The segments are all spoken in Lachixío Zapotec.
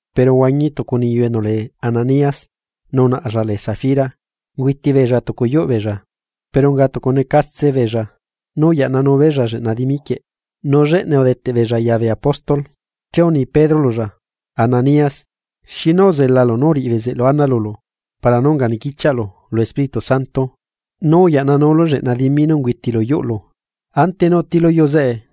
Pero uhuañi stucu niyu enu lee Ananías, nu unaꞌlla lee Safira, ungüiti beella tucu yuꞌ beella. Pero unga tucu necatse beella nú uyaꞌnanu beella lleꞌna dimi quieꞌ nu lleꞌnae udeteꞌlla ya bee apóstol. Che uni Pedro lulla: ―Ananías, ¿xinu uzelalu nú uriꞌi bezeꞌlu ana lulu para nú unga niquichiaꞌlu lu Espíritu Santo nú uyaꞌnanulu lleꞌna dimi nú ungüitilu yuꞌlu? Ante nú utilu yuu zeꞌe,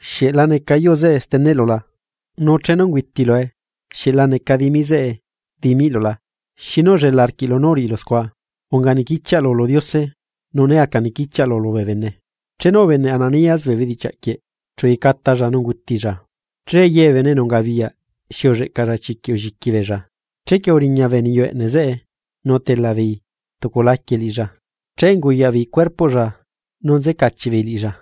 ¿xieꞌ la neca yuu zeꞌe steneꞌlula? nu chenu ungüitilue, ¿xieꞌ la neca dimi zeꞌe dimiꞌlu la? ¿Xinu ullela arquiꞌlu nú uriꞌilu scua? Unga niquichiaꞌlu lu Diose nu né aca nequichiaꞌlu lubee bene. Chenu ubeneꞌ Ananías bee bedichiaꞌ quieꞌ chu uyecatalla luyuu nu ungutilla. Che ye bee bene enu ungabiyaꞌ xi ulleꞌcalla chiquiꞌ ulliqui beella. Chequie uriña bee niyu eꞌneꞌ zeꞌe nu utela beei tucu laquie cuerpoꞌlla Che unguyaꞌbeei cuerpoꞌlla nu uyacaꞌchiꞌ beei liꞌilla.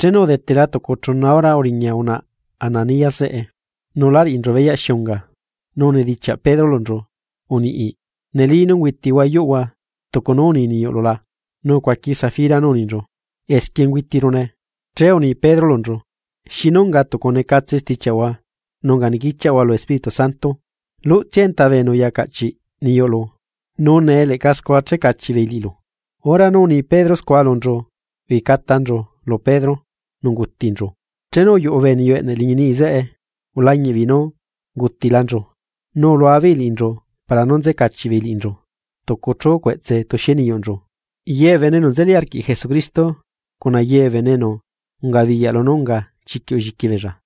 Chenu udetela tucu chuna hora uriña unaꞌa Ananías zeꞌe nu la riꞌinchu beyaꞌ xi unga. Nu unidichiaꞌ Pedro lunchu: ―Uniꞌ, ¿neli nú ungüitihua yuꞌhua tucu nú uni niyuꞌlu la? Nu ucuaqui Safira nú uninchu: ―Esquie ungüitirune. Che uni Pedro lunchu: ―¿Xinu unga tucu necatse stichiaꞌhua nu unga nequichiaꞌhua lu Espíritu Santo? Luꞌtsia enta bee bene enu uya caꞌchiꞌ niyuꞌlu, nu nee leꞌca scua che cachiꞌ beei liꞌilu. Hora nú uni Pedro scua lunchu uyecatanchu lu Pedro nu ungutinchu. Chenu uyuꞌu bee niyu eꞌneꞌ liñi niꞌi zeꞌe ulañiꞌbeei nú ungutilanchu. Nu ulua beei liꞌinchu para nú nzecachiꞌ beei liꞌinchu tucu chu cueꞌtse tuxie niyuꞌnchu. Ye bee bene enu nzeli arquiꞌ Jesucristo, cuna ye bee bene enu ungabiyaꞌ lunú unga chiquiꞌ ulliqui beella.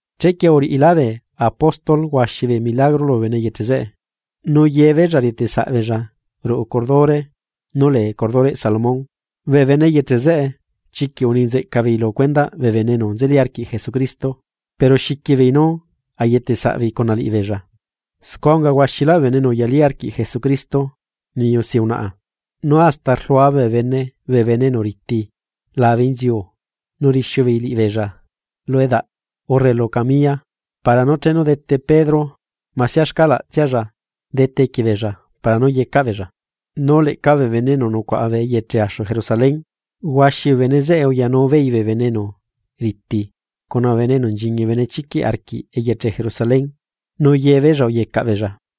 Chequie uriꞌilá bee apóstol huaxi bee milagro lubee bene eyeche zeꞌe; nu yebeella rieteꞌsaꞌbeella ruꞌu cordure nú lee cordureꞌ Salomón. Bee bene eyeche zeꞌe chiquiꞌ uni nzeꞌca beei lu cuendaꞌ bee bene enu nzeli arquiꞌ Jesucristo, pero xiqui beei nú ayeteꞌsaꞌbeei cuna liꞌibeella. Scua unga huaxilá bee bene enu uyalí arquiꞌ Jesucristo niyu si unaꞌa. Nu hasta rlua bee bene bee bene enu riti labe inziu nu rixiu beei liꞌibeella lu edaꞌ urre lu camilla para nú chenu dete Pedro masia xcaꞌlalla dete equie beella para nú yecaꞌ beella. Nu leꞌca bee bene enu nucuaꞌa bee eyeche axu Jerusalén, huaxi bee bene zeꞌe uyanu beei bee bene enu riti cuna bee bene enu nchiñi benechiquiꞌ arquiꞌ eyeche Jerusalén nu yebeella uyecaꞌ beella.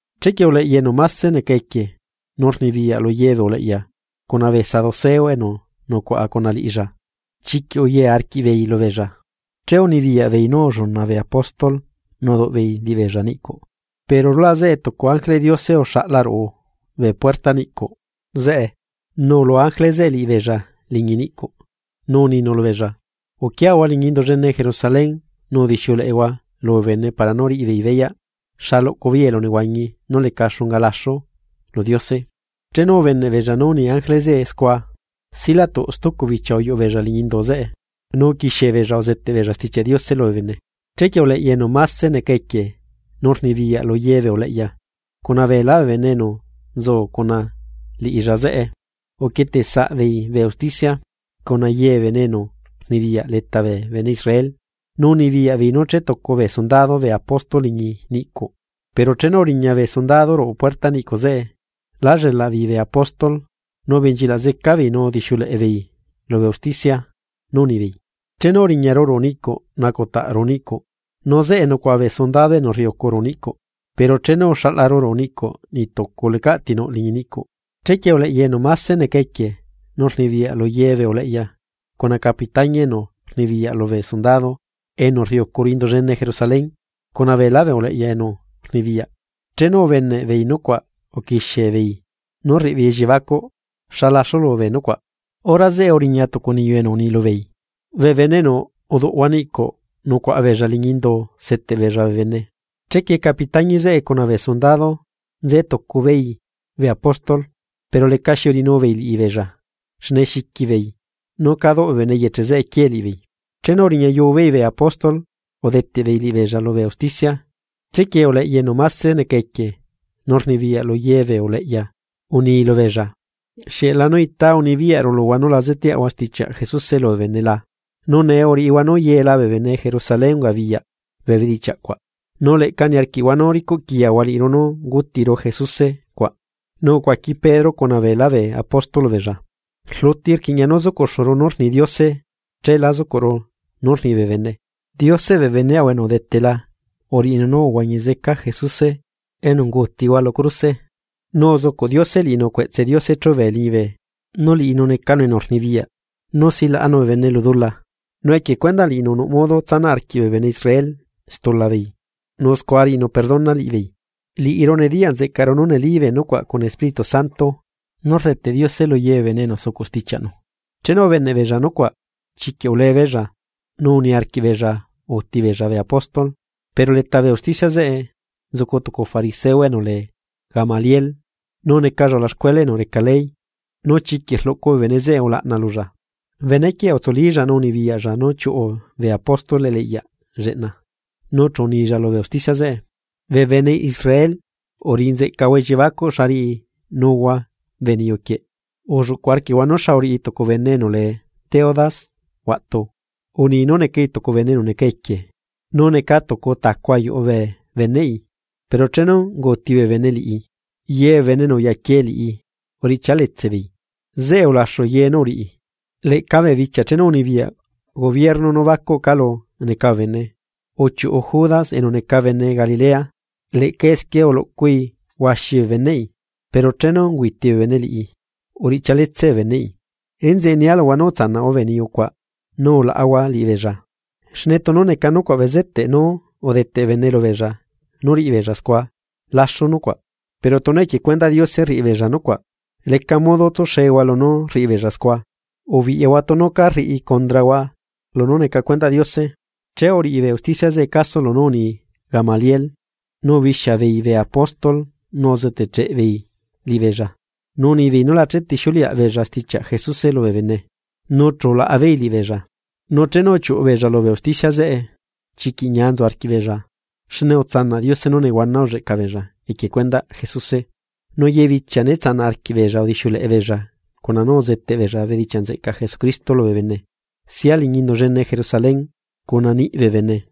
Chequie uleꞌya enu máse neca equie nu rnibiyaꞌ lu ye bee uleꞌya cuna bee saduceo enu nucuaꞌa cuna liꞌilla, chiquiꞌ uye arquiꞌbeei lubeella. Che unibiyaꞌ beei nú ulluna bee apóstol nu uduꞌ beei liꞌibeella niꞌcuꞌ. Pero rulaꞌ zeꞌe tucu ángeleꞌ Diose uxaꞌla ruꞌu bee puertaꞌ niꞌcuꞌ zeꞌe. Nu ulua ángele zeꞌe liꞌibeella liñi niꞌcuꞌ, nu uninu lubeella: ―Uquiahua liñi Indu llene Jerusalén nu udixiuleꞌehua lubee bene para nú riꞌibeei beyaꞌ xa luꞌcu beei elunehuañi nú leca xunga laxu lu Diose. Chenu ubeneꞌbeella nú uni ángele zeꞌe scua. Silatuꞌ stucu bichia uyuꞌu beella liñi indu zeꞌe, nu uquixiebeella uzeteꞌ beella Stichiaꞌ Diose lubee bene. Chequie uleꞌya enu máse neca equie nu rnibiyaꞌ lu ye bee uleꞌya cuna beelá bee bene enu nzu cuna liꞌilla zeꞌe, uquieteꞌ saꞌbeei bee usticia cuna ye bee bene enu rnibiyaꞌ leta bee bene Israel, nu unibiyaꞌ beei nú chetucu bee sundado bee apóstol liñi niꞌcuꞌ. Pero chenu uriña bee sundado ruꞌu puerta niꞌcuꞌ zeꞌe, lá llelaꞌbeei bee apóstol, nu ubenchilaꞌ zeca beei nu udixiuleꞌe beei lubee usticia. Nu unibeei: ―Chenu uriñaru ruꞌu niꞌcuꞌ nacutaꞌ ruꞌu niꞌcuꞌ, nu zeꞌe nucuaꞌa bee sundado enu rriucu ruꞌu niꞌcuꞌ. Pero chenu uxaꞌlaru ruꞌu niꞌcuꞌ niꞌtucu lecaꞌ ti nuꞌ liñi niꞌcuꞌ. Chequie uleꞌya enu máse neca equie nu rnibiyaꞌ lu ye bee uleꞌya cuna capitañi enu rnibiyaꞌ lubee sundado enu rriucu Indu llene Jerusalén cuna beelá bee uleꞌya enu rnibiyaꞌ, chenu ubeneꞌbeei nucuaꞌ uquixiebeei nú rriꞌibeei elliebacuꞌ xa laxulu bee nucuaꞌ. Hora zeꞌe uriña tucu niyu enu uni lubeei: ―Bee bene enu uduꞌhua niꞌcuꞌ nucuaꞌala beella liñi indu seteꞌ beella bee bene. Chequie capitañi zeꞌe cuna bee sundado nzetucu beei bee apóstol, pero lecaxi uriꞌinu beei liꞌibeella xne xiqui beei nú cá duꞌ bee bene eyeche zeꞌe quiee liꞌibeei. Chenu uriñayu beei bee apóstol udeteꞌbeei liꞌibeella lubee usticia, chequie uleꞌya enu máse neca equie nu rnibiyaꞌ lu ye bee uleꞌya uni lubeella: ―¿Xieꞌlanú ita unibiyaꞌru luhua nú la zeteaꞌhua stichiaꞌ Jesuse lubee bene la? Nu nee uriꞌihua nú yela bee bene Jerusalén ungabiyaꞌ bee bedichiaꞌ cuaꞌ, nu leꞌca niarquiꞌhua nú ricuꞌquiyahua liꞌiru nú ungutiru Jesuse cuaꞌ. Nu ucuaqui Pedro cuna beelá bee apóstol lubeella: ―Rluti rquiꞌña nú zucuꞌxuru nú rni Diose cheela zucuꞌru nú rni bee bene. Dioseꞌ bee beneꞌahua enu udetela uriꞌinu nú uhuañi zeca Jesuse enu ungutihua lu cruse. Nu uzucuꞌ Diose liꞌinu cueꞌtse Diose chúbe liñibe, nu liꞌinu necanu enu rnibiyaꞌ nu silaꞌanu bee bene lu dula, nu equie cuendaꞌ liꞌinu nuꞌ modo nú tsanaꞌ arquiꞌ bee bene Israel stula beei nu scua riꞌinu perdona liꞌibeei. Liꞌiru nediyaꞌ nzeꞌcaru nú neli bee nucuaꞌ cuna Espíritu Santo nú rdeteꞌ Diose lu ye bee bene enu sucuꞌ stichiaꞌnu. Chenu ubeneꞌbeella nucuaꞌ, chiquiꞌ ulebeella nu niarquiꞌbeella úti beella bee apóstol Pero leta bee usticia zeꞌe nzucu tucu fariseo enu lee Gamaliel, nu necalla ulaxcuela enu reca ley, nu chiquiꞌ rluꞌcu bee bene zeꞌe ulaꞌna lulla. Benequieꞌ utsulílla nu unibiyaꞌlla nú chiuꞌu bee apóstol eliꞌyaꞌ lleꞌna. Nu chu unilla lubee usticia zeꞌe: ―Bee bene Israel, uriꞌi nzeꞌcahua elliebacuꞌ xa riꞌinuhua bee niyu quieꞌ. Ulluꞌcu arquiꞌhua nú xa uriꞌi tucu bene enu lee Teudas huaꞌtu, uni nú necai tucu bene enu neca equie, nu neca tucu tacu ayuꞌu bee beneꞌi, pero chenu unguuti bee bene liꞌi, ye bee bene enu uyaquie liꞌi uriꞌchia letse beei, zeꞌe ulaxu ye nu uriꞌi. Leꞌca bee bichia chenu unibiyaꞌ gobierno nú bacuꞌ calu neca bee bene. Uchiuꞌu Judas enu neca bene Galilea, leꞌca esquie uluꞌcui huaxi bee beneꞌi, pero chenu unguuti bee bene liꞌi, uriꞌchia letse bee beneꞌi. Enzeꞌe nia luhua nú utsanaꞌhua bee niyu cuaꞌ, nu ulaꞌahua liꞌibeella. Xne tunu neca nucuaꞌ bezeteꞌ nú udeteꞌ bee bene lubeella nú riꞌibeella scua, laxu nucuaꞌ. Pero tunu equie cuendaꞌ Diose rriꞌibeella nucuaꞌ, leca modo tsuxehua lunú rriꞌibeella scua. Ubiꞌyahua tunu cá rriꞌi condrahua lunú neca cuendaꞌ Diose. Che uriꞌi bee usticia zeꞌe caso lunú uni Gamaliel, nu ubixia beei bee apóstol nu uzetecheꞌ beei liꞌibeella, nu unibeei nú la chetixiuleaꞌ beella stichiaꞌ Jesuse lubee bene, nu chu ulaꞌa beei liꞌibeella. Nu chenu uchiuꞌu beella lubee usticia zeꞌe, chiquiꞌ ñia nzu arquiꞌbeella xne utsanaꞌ Diose nú nehuana ulleꞌca beella equie cuendaꞌ Jesuse. Nu ye bichia né tsanaꞌ arquiꞌbeella udixiuleꞌe beella cuna nú uzeteꞌ beella bedichiaꞌ nzeꞌcaꞌ Jesucristo lubee bene, sia liñi Indu llene Jerusalén cuna niꞌ bee bene.